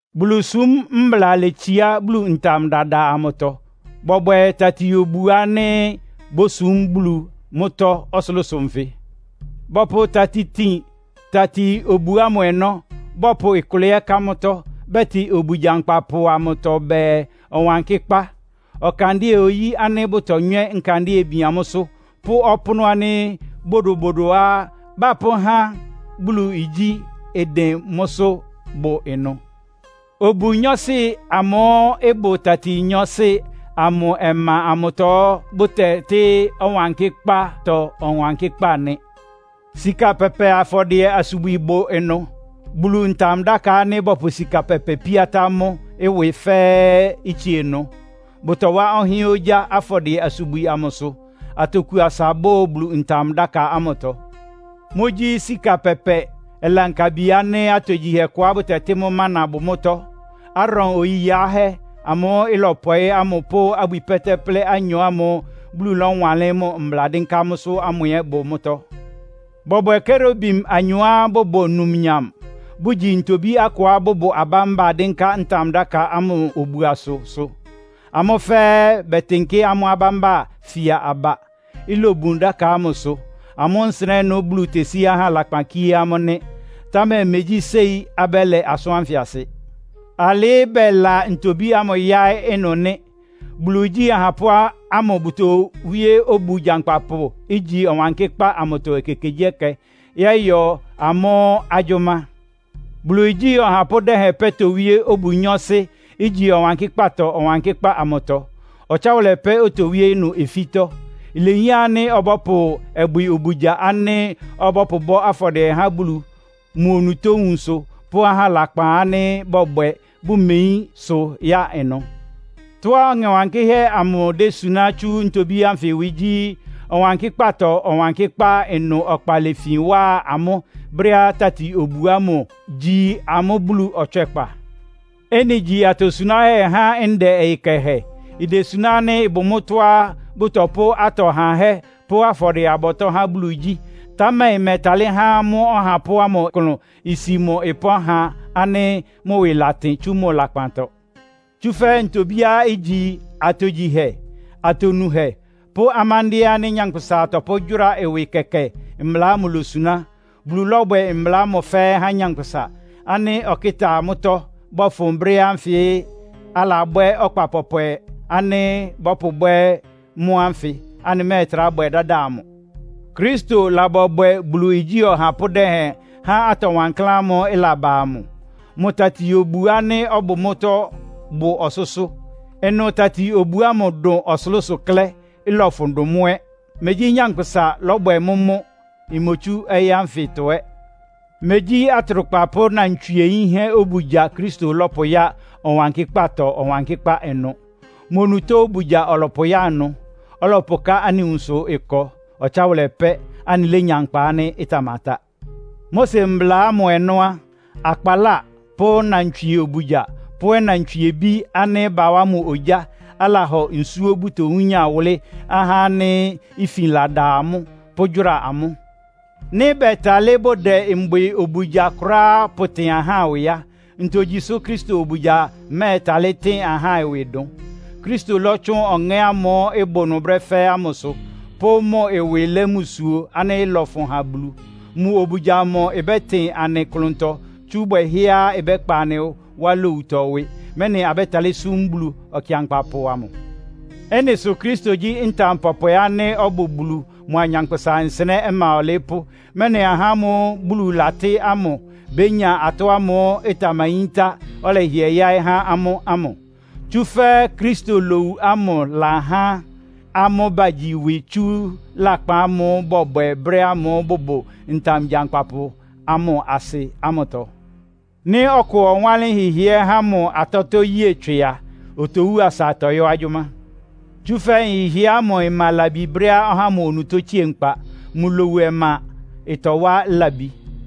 Bulusúm mbla letsiá Bulu ntam dada amʋtɔ. Bɔbwɛ tati-obu ánɩ́ bósum Bulu mʋ́tɔ́ ɔsʋlʋ́sʋ nfɩ. Bɔpʋ tati tin tati-obu ámʋ ɔnɔ́, bɔpʋ ɩkʋlɛ ɛ́ ká mʋ́tɔ́. Bɛtɩ obu gyankpapʋ amʋtɔ bɛɛ, Ɔwankɩ́kpá. Ɔkandɩ́ɛ-oyí ánɩ́ bʋtonywɛ́ nkandɩ́ɛ bian mʋ́sʋ́ pʋ́ ɔpʋ́nʋ́ ánɩ́ bodobodoá bapʋ́há Bulu igyí ɩdɩn mʋ́sʋ́ bʋ ɩnʋ. Obu nyɔɔsɩ amʋ́ʋ́ ɩbʋ tati nyɔɔsɩ amʋ ɔma amʋtɔ bʋtɛtɩ́, Ɔwankɩ́kpátɔ Ɔwankɩ́kpá nɩ. Sika pɛpɛ afɔdɩɛ-asubwi bʋ ɩnʋ. Bulu Ntam-dáka ánɩ́ bɔpʋ sika pɛpɛ píatá mʋ́ ɩwɩ fɛ́ɛ́ ɛ́ itsie ɩnʋ. Bʋtɔwá ɔhɩ́ɛ́n ogyá afɔdɩɛ-asubwi ámʋsʋ. Atoku asa bʋ́ʋ Bulu Ntam-dáka ámʋtɔ. Mʋ́gyí, sika pɛpɛ ɔlankabi ánɩ́ atogyihɛ kʋá bɛtɩ mʋ́ mana bʋ mʋ́tɔ́, Aaron oyi yiáhɛ́ amʋ́ʋ́ ɩlɔpɔɩ́ ámʋ pʋ́ abwi pɛ́tɛ́plɛ́ anyɔ ámʋ́ʋ́ Bulu lɔ́wanlɩ́n mʋ mbla dɩ́nká mʋ́sʋ́ ámʋ ɛ́ bʋ mʋ́tɔ́. Bɔbwɛ Kerubim anyɔá bʋbʋ numnyam, bʋgyi ntobí akʋá bʋbʋ abámba dɩ́nká ntam-dáka ámʋ obuasʋsʋ. Amʋ́ fɛ́ɛ́ bɛtɩnkɩ́ amʋ́ abámba fia aba, ilobun dáka ámʋsʋ. Amʋ́ nsɩnɛ́ ɩnʋ Bulu tesí ahá lakpan kíé amʋ́ nɩ́. Támɛ megyí séi abɛ́lɛ asʋ́n ánfɩ asɩ. Alɩ́ bɛla ntobí ámʋ yáɩ́ ɩnʋ nɩ́. Bulu igyí ahapʋ́ ámʋ bʋtowíé obu gyankpapʋ, igyi Ɔwankɩ́kpá amʋtɔ ekekegyíɛkɛ yɔ́yɔ amʋ́ agyʋ́má. Bulu igyí ɔhapʋ́ dɛhɛn pɛ́ towíé obu nyɔɔsɩ, igyi Ɔwankɩ́kpátɔ Ɔwankɩ́kpá amʋtɔ. Ɔtsáwʋlɛ pɛ́ otowíé ɩnʋ ofítɔ́. Ilehián ánɩ́ ɔbɔ́pʋ ɔbwɩ obugya ánɩ́ ɔbɔ́pʋbɔ́ afɔdɩɛ há Bulu mʋ onutó nwunsʋ pʋ́ ahá lakpan ánɩ́ bɔbwɛ, bʋmeyín sʋ ya ɩnʋ. Tɔ́á Ɔŋɛ Wankɩ́hɛ́ amʋ désuná tsú ntobí ánfɩ ɩwɩ gyí, Ɔwankɩ́kpátɔ Ɔwankɩ́kpá ɩnʋ ɔkpa lefin wa amʋ́ brɛ́á tati-obu ámʋ gyí amʋ́ Bulu ɔtswɛ́kpa. Ɩ́nɩ igyi atosuánhɛ há ndɛ ɔyɩ kɛhɛ. Idesuná ánɩ́ ɩbʋ mʋ́tɔ́á bʋtɔpʋ́ atɔ hahɛ́ pʋ́ afɔdɩɛ-abɔtɔ́ há Bulu igyí, támɛ ɩmɛ́ɛtalɩ́ há mʋ́ ɔhapʋ́ ámʋ klʋn isi mʋ ɩpɔ́n ha ánɩ́ mʋ ɩwɩ latɩn tsú mʋ lakpantɔ. Tsúfɛ́ ntobíá igyi, atogyihɛ, atonuhɛ pʋ́ amándɩ́ɛ́ ánɩ́ nyankpʋsa tɔpʋ́gyʋ́ra ɩwɩ kɛkɛ mbla ámʋ losuná. Bulu lɔ́bwɛ mbla ámʋ fɛ́ɛ́ há nyankpʋsa, ánɩ́ ɔkɩ́ta mʋ́tɔ́ bɔfʋn brɛ́ ánfɩ alabwɛ́ ɔkpa pɔpwɛ ánɩ́ bɔ́pʋbwɛ́ mʋ́ ánfɩ, anɩmɛ́ɛtrá bwɛ dáda amʋ. Kristo labɔbwɛ Bulu igyí ɔhapʋ́ dɛhɛn há atɔ wankláán ámʋ́ʋ́ ɩlaba ámʋ. Mʋ tati-obu ánɩ́ ɔbʋ mʋ́tɔ́ bʋ ɔsʋ́sʋ́. Ɩnʋ tati-obu ámʋ dʋn ɔsʋlʋ́sʋ klɛ́, ɩlɔfʋn dʋn mʋ́ ɛ́. Megyí nyankpʋsa lɔ́bwɛ mʋ́ mʋ́, imotsú ɔyɩ́ ánfɩtɔ ɛ́. Megyí atrʋkpa pʋ́ nnantswie yínhɛ́ obugya Kristo lɔ́pʋya Ɔwankɩ́kpátɔ Ɔwankɩ́kpá ɩnʋ. Mʋ onutó obugya ɔlɔpʋya ɩnʋ, ɔlɔpʋká anɩ nwunsʋ ɩkɔ ɔtsáwʋlɛ pɛ́, anɩlénya nkpa ánɩ́ ɩtamatá. Mose mbla ámʋ ɔnɔ́ á, akpaláa pʋ́ nnantswie obugya pʋ́ ɔnantswiebí ánɩ́ bawá mʋ ogyá, alahɔ nsúó bʋtowúnya wʋlɩ́ ahá ánɩ́ ifin lada amʋ́, pʋ́gyʋ́ra amʋ́. Nɩ́ bɛtalɩ́ bʋdɛ mbwɩ obugya kʋ́ráá pʋtɩn ahá ɩwɩ á, ntogyi sʋ Kristo obugya mɛ́ɛtalɩ́ tɩn ahá ɩwɩ dʋn? Kristo lɔ́tsʋn Ɔŋɛ́ ámʋ́ʋ́ ɩbʋ ɩnʋ brɛ́ fɛ́ɛ́ ámʋsʋ, pʋ́ mʋ ɩwɩ lɛ́ mbusuo ánɩ́ ɩlɔfʋn há Bulu. Mʋ obugya amʋ ɩbɛ́tɩn anɩ klʋntɔ tsú bwɛhɛ́á ɩbɛ́kpa anɩ wá lowutɔ ɩwɩ, mɛ́nɩ abɛ́talɩ́ súm Bulu Ɔkɩankpapʋ amʋ. Ɩ́nɩ sʋ Kristo gyí ntam pɔpwɛ ánɩ́ ɔbʋ Bulu mʋa anyánkpʋ́sa nsɩnɛ́ ɔma ɔlɩɩ́pʋ́, mɛ́nɩ ahá ámʋ́ʋ́ Bulu latɩ́ ámʋ bénya atɔ́ ámʋ́ʋ́ ɩtamayíntá, ɔlɛhɩɛ yáɩ́ há amʋ́ ámʋ. Tsúfɛ́ Kristo lowu ámʋ ɩlahá amʋ́ bagyi ɩwɩ tsú lakpan ámʋ́ʋ́ bɔbwɛ brɛ́ ámʋ́ʋ́ bʋbʋ ntam gyankpapʋ amʋ asɩ ámʋtɔ. Nɩ́ ɔkʋ ɔwánlɩ́n nhɩhɩɛ́ há mʋ atɔ́tɔ́ yée tswɩ a, otowú asa ɩtɔyɔ́ agyʋ́má. Tsúfɛ́ nhɩhɩɛ́ ámʋ ɩma labi brɛ́á ɔhá ámʋ onutó tsie nkpa. Mʋ lowu ɔma ɩtɔwá labi.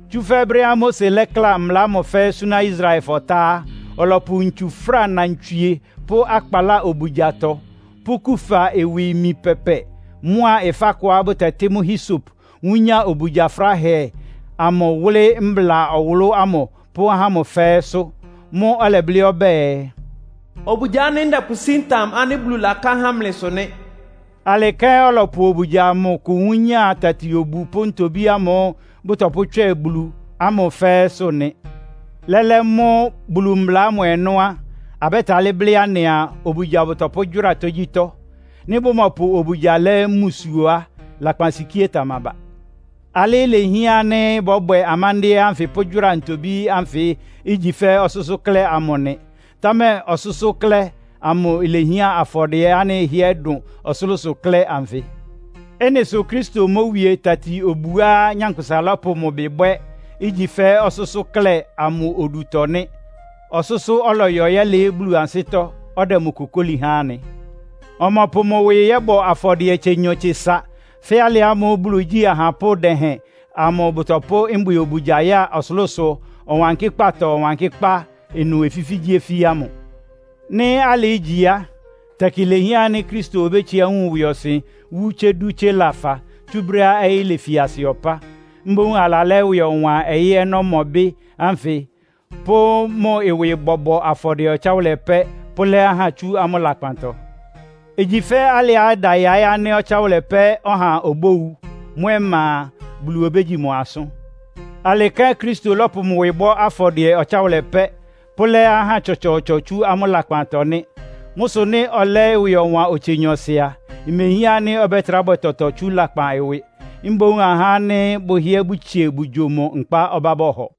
Tsúfɛ́ brɛ́á Mose lɛ́kla mbla ámʋ fɛ́ɛ́ súná Israelfɔ tá á, ɔlɔpʋ ntsu fráa nnantswie pʋ́ akpaláa obugyatɔ, pʋ́ kufa ɩwɩ imi pɛpɛ mʋ́a ɩfá kʋá bʋtɛtɩ́ mʋ́ Hisop wúnya obugya fráhɛ amʋ wʋ́lɩ́ mbla ɔwʋlʋ́ ámʋ pʋ́ ahá ámʋ fɛ́ɛ́sʋ́. Mʋ́ʋ́ ɔlɛblɩ́ ɔbɛ́ɛ, “Obugya ánɩ́ ndɛpʋsí ntam ánɩ́ Bulu laká há mlɩsʋ nɩ́.” Alɩ kɛ́n ɔlɔpʋ obugya amʋ kʋ wúnya tati-obu pʋ́ ntobí ámʋ́ʋ́ bʋtɔpʋ́tswɛ Bulu ámʋ fɛ́ɛ́sʋ́ nɩ. Lɛ́lɛ́ mʋ́ Bulu mbla ámʋ ɔnɔ́ á, abɛ́talɩ́ blɩ́ anɩaa, obugya bʋtɔpʋ́gyʋ́ra tógyítɔ́. Nɩ́ bʋmɔpʋ obugya lɛ́ mbusuo á, lakpansikíé tamaba. Alɩ ilehián ánɩ́ bɔ́bwɛ amándɩ́ɛ́ ánfɩ pʋ́gyʋ́ra ntobí ánfɩ ígyi fɛ́ ɔsʋ́sʋ́ klɛ́ amʋ nɩ. Támɛ ɔsʋ́sʋ́ klɛ́ amʋ ilehián afɔdɩɛ ánɩ́ ɩhɩ́ɛ́ dʋn ɔsʋlʋ́sʋ klɛ́ anfɩ. Ɩ́nɩ sʋ́ Kristo mówie tati-obuá nyankpʋsa lɔ́pʋ mʋ ɩbɩ bwɛ́, igyi fɛ́ ɔsʋ́sʋ́ klɛ́ amʋ odutɔ nɩ́. Ɔsʋ́sʋ́ ɔlɔyɔ yɛ́lɩɩ́ Bulu ansɩ́tɔ́, ɔdɛ mʋ kokóli ha anɩ. Ɔmɔpʋ mʋ ɩwɩ yɔ́bɔ afɔdɩɛ tsenyɔ-tsesa, fɛ́ alɩ ámʋ́ʋ́ Bulu igyí ahapʋ́ dɛhɛn amʋ bʋtɔpʋ́ mbwɩ obugya ya ɔsʋlʋ́sʋ Ɔwankɩ́kpátɔ Ɔwankɩ́kpá ɩnʋ ofífígyíofí ámʋ. Nɩ́ alɩ ígyi á, tɛkɩ ilehián ánɩ́ Kristo obétsiá wun ɩwɩɔsɩn wú tsé dú tsé lafa, tsú brɛ́á ɔyɩ́ lefi asɩ ɔpá. Mboún alalɛ́ ɩwɩ ɔwan ɔyɩ́ ɔnɔ́mɔbɩ́ ánfɩ, pʋ́ mʋ ɩwɩ bɔbɔ afɔdɩɛ ɔtsáwʋlɛ pɛ́ pʋ́lɛ́ ahá tsú amʋ́ lakpantɔ. Igyi fɛ́ alɩá ɩda yáɩ́ ánɩ́ ɔtsáwʋlɛ pɛ́ ɔha obówu. Mʋ́ ɔma a, Bulu obégyi mʋ asʋ́n. Alɩ kɛ́n Kristo lɔ́pʋ mʋ ɩwɩ bɔ́ afɔdɩɛ ɔtsáwʋlɛ pɛ́, pʋ́lɛ́ ahá tsɔtsɔɔtsɔ tsú amʋ́ lakpantɔ nɩ́. Mʋ́ sʋ nɩ́ ɔlɛ́ ɩwɩ ɔwan otse nyɔɔsɩ a, imehián ánɩ́ ɔbɛ́trá bwɛ tɔtɔ tsú lakpan ɩwɩ. Mboún ahá ánɩ́ bʋhɩ́ɛ́ bʋtsie bʋgyo mʋ nkpa ɔbá bɔhɔ.